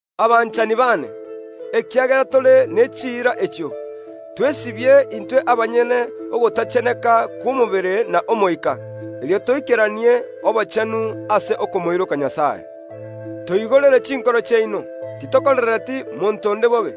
Abanchani baane, ekiagera tore ne chiira echio, twesibie intwe abanyene ogotacheneka kw’omobere na omoika, erio toikeranie obochenu ase okomoiroka Nyasae. Toigorere chinkoro chiaino; titokorereti monto onde bobe,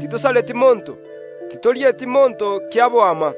titosareti monto, titorieti monto kiaboama.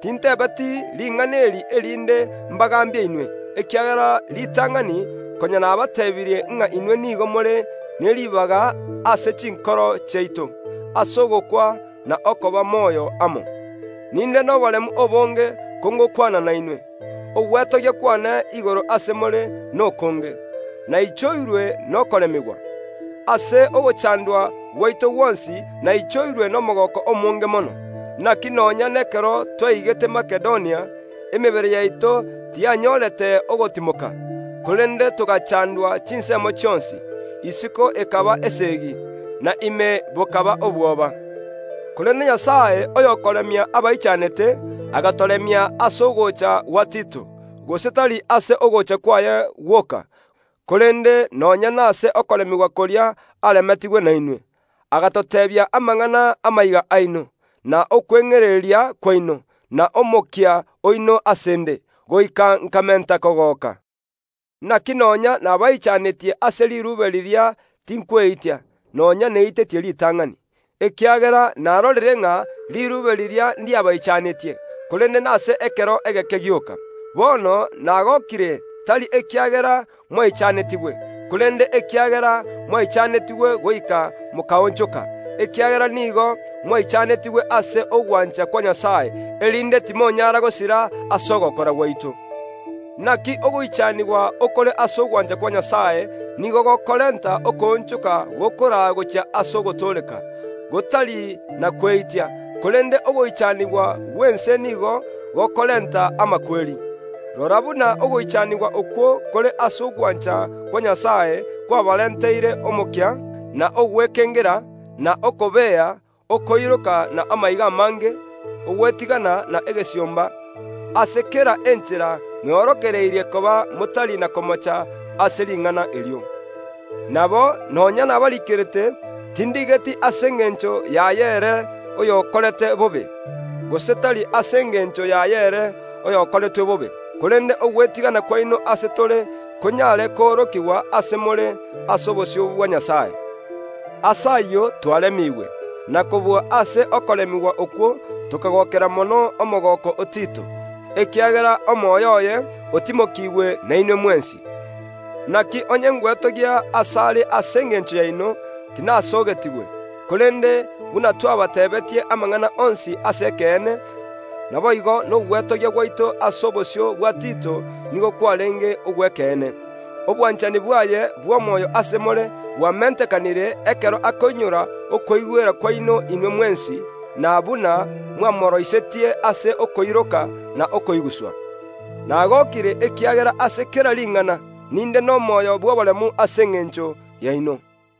Tintebeti ring’ana eri erinde mbagambie inwe, ekiagera ritang’ani konya nabateebirie ng’a inwe nigo more ne ribaga ase chinkoro chiaito, ase ogokwa na okoba moyo amo. Ninde noboremu obonge kongokwana nainwe; ogwetogia kwane igoro ase more nokonge; naichoirwe nokoremigwa. Ase ogochandwa gwaito gwonsi naichoirwe nomogooko omonge mono. Naki nonya nekero twaigete Makedonia, emebere yaito tiyanyorete ogotimoka, korende togaachandwa chinsemo chionsi; isiko ekaba esegi, na ime bokaba obwoba. Korende Nyasae, oyokoremia abaichanete, agatoremia ase ogocha gwa Tito, gose tari ase ogocha kwaye gwoka, korende nonya nase okoremigwa koria aremetigwe nainwe. Agatoteebia amang’ana y’amaiga aino, na okweng’ereria kwaino, na omokia oino ase ’nde, goika nkamenta kogoka. Naki nonya nabaichanetie ase riruube riria tinkweitia (nonya neitetie ritang’ani), ekiagera narorire ng’a riruube riria ndiabaichanetie, korende nase ekero egeke gioka. Bono nagokire, tari ekiagera mwaichanetigwe, korende ekiagera mwaichanetigwe goika mokaonchoka, ekiagera nigo mwaichanetigwe ase ogwancha kwa Nyasae, erinde timonyara gosira ase ogokora gwaito. Naki ogoichanigwa okore ase ogwancha kwa Nyasae nigo gokorenta okoonchoka gokoraa gochia ase ogotooreka, gotari na kweitia; korende ogoichanigwa gw’ense nigo gokorenta amakweri. Rora buna ogoichanigwa okwo kore ase ogwancha kwa Nyasae kwabarenteire omokia, na ogwekengera, na okobea, okoiroka na amaiga amange, ogwetigana na egesiomba! Ase kera enchera mweorokererie koba motari na komocha ase ring’ana erio. Nabo, nonya nabariikerete, tindigeti ase engencho yaye ere oyokorete bobe, gose tari ase engencho yaye ere oyokoreretwe bobe, korende ogwetigana kwaino ase tore konyare koorokigwa ase more ase obosio bwa Nyasae. Ase ayio twaremiigwe. Na kobua ase okoremigwa okwo tokagookera mono omogooko o Tito, ekiagera omoyo oye otimokigwe nainwe mwensi. Naki onye ngwetogia asare ase engencho yaino, tinasoogetigwe; korende buna twabateebeetie amang’ana onsi ase ekeene, naboigo nogwetogia gwaito ase obosio bwa Tito nigo kwarenge ogw’ekeene. Obwanchani bwaye bw’omoyo ase more bwamentekanire, ekero akoinyora okoigwera kwaino inwe mwensi, na buna mwamoroisetie ase okoiroka na okoiguswa. Nagokire, ekiagera ase kera ring’ana ninde nomoyo bw’oboremu ase engencho yaino.